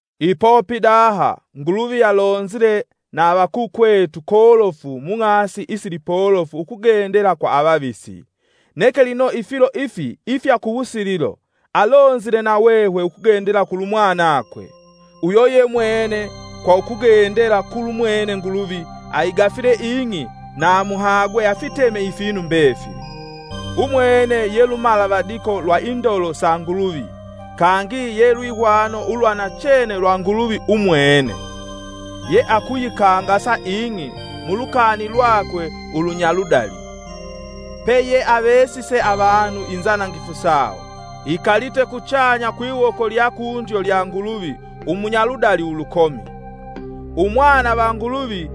Ipo pidaha, Nguluvi alonzile na avakukwetu kolofu mung'asi isilipolofu ukugendela kwa avavisi, neke lino ifilo ifi ifya kuwusililo, alonzile nahwehwe ukugendela kulu Mwanakwe. Uyo yemwene kwa ukugendela kulu mwene Nguluvi aigafile ing'i na amuhagwe afiteme ifinu mbefili. Umwene ye lumalavadiko lwa indolo sa Nguluvi kangi ye lwihwano ulwa nachene lwa Nguluvi umwene, yeakuyikangasa ing'i mulukani lwakwe ulunyaludali. Peyeavesise avanu inzanangifu sawo, ikalite kuchanya kwiwoko lya kundyo lya Nguluvi umunyaludali ulukomi. Uwuvina wa Umwana va Nguluvi.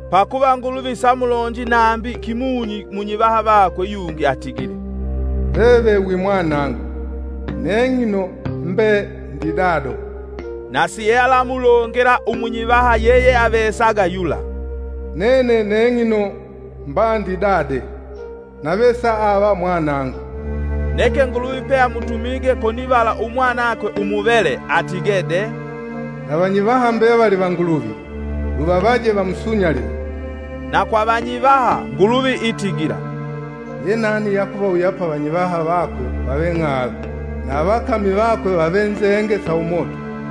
Pakuva Nguluvi samulonji nambi kimunyi munyivaha vakwe yungi atigile. “Veve wi mwanangu; neng'ino mbe ndi Dado.” Na siealamulongela umunyivaha yeyeavesaga yula: “Nene neng'ino mba ndi dade, nave saave Mwanangu.” Neke Nguluvi peamutumige konivala Umwanakwe umuvele atige de: “Na vanyivaha mbevali va Nguluvi, luvavaje vamusunyalile.” Na kwa vanyivaha, Nguluvi itigila, “Ye nani ye akuvawuyapa avanyivaha vakwe vave ng'ala, na avakami vakwe vave nzenge sa umoto.”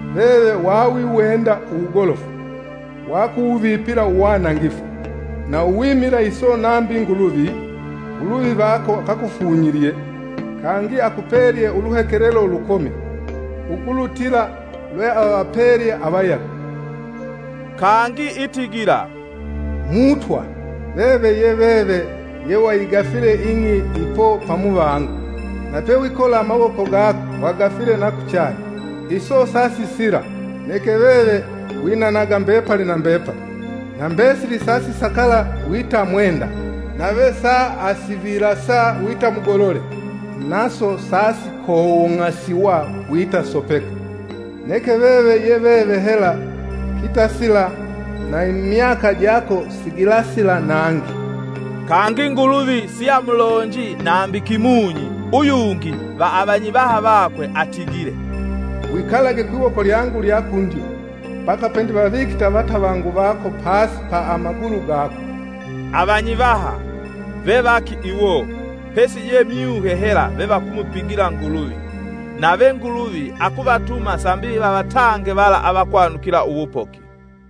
Veve wawiwenda uwugolofu, wakuwuvipila uwanangifu. Na uwimila iso nambi Nguluvi, Nguluvi vako akakufunyilye, kangi akupelye uluhekelelo ulukomi ukulutila lweavapelye avayago.” Kangi itigila: “Mutwa, veve ye veve yewayigafile ing'i ipo pamuvango, na pe wikola amawoko gako wagafile na kuchanya. Iso sa sisila, neke veve winanaga mbepali na mbepali. Na mbesili sa sisakala wita mwenda. Nave sa asivilasa wita mugolole, naso sasikowong'asiwa wita sopeka. Neke veve ye veve hela kitasila na imyaka jako sigilasila nangi.” Kangi Nguluvi siamulonji nambi kimunyi uyungi va avanyivaha vakwe atigile: “Wikalage kwiwoko lyangu lya kundyo mbaka pendivavikite avatavangu vako pasi pa amagulu gako.” Avanyivaha, vevaki iwo pesi je myuhe hela vevakumupigila Nguluvi, nave Nguluvi akuvatuma sambi vavatange vala avakwanukila uwupoki.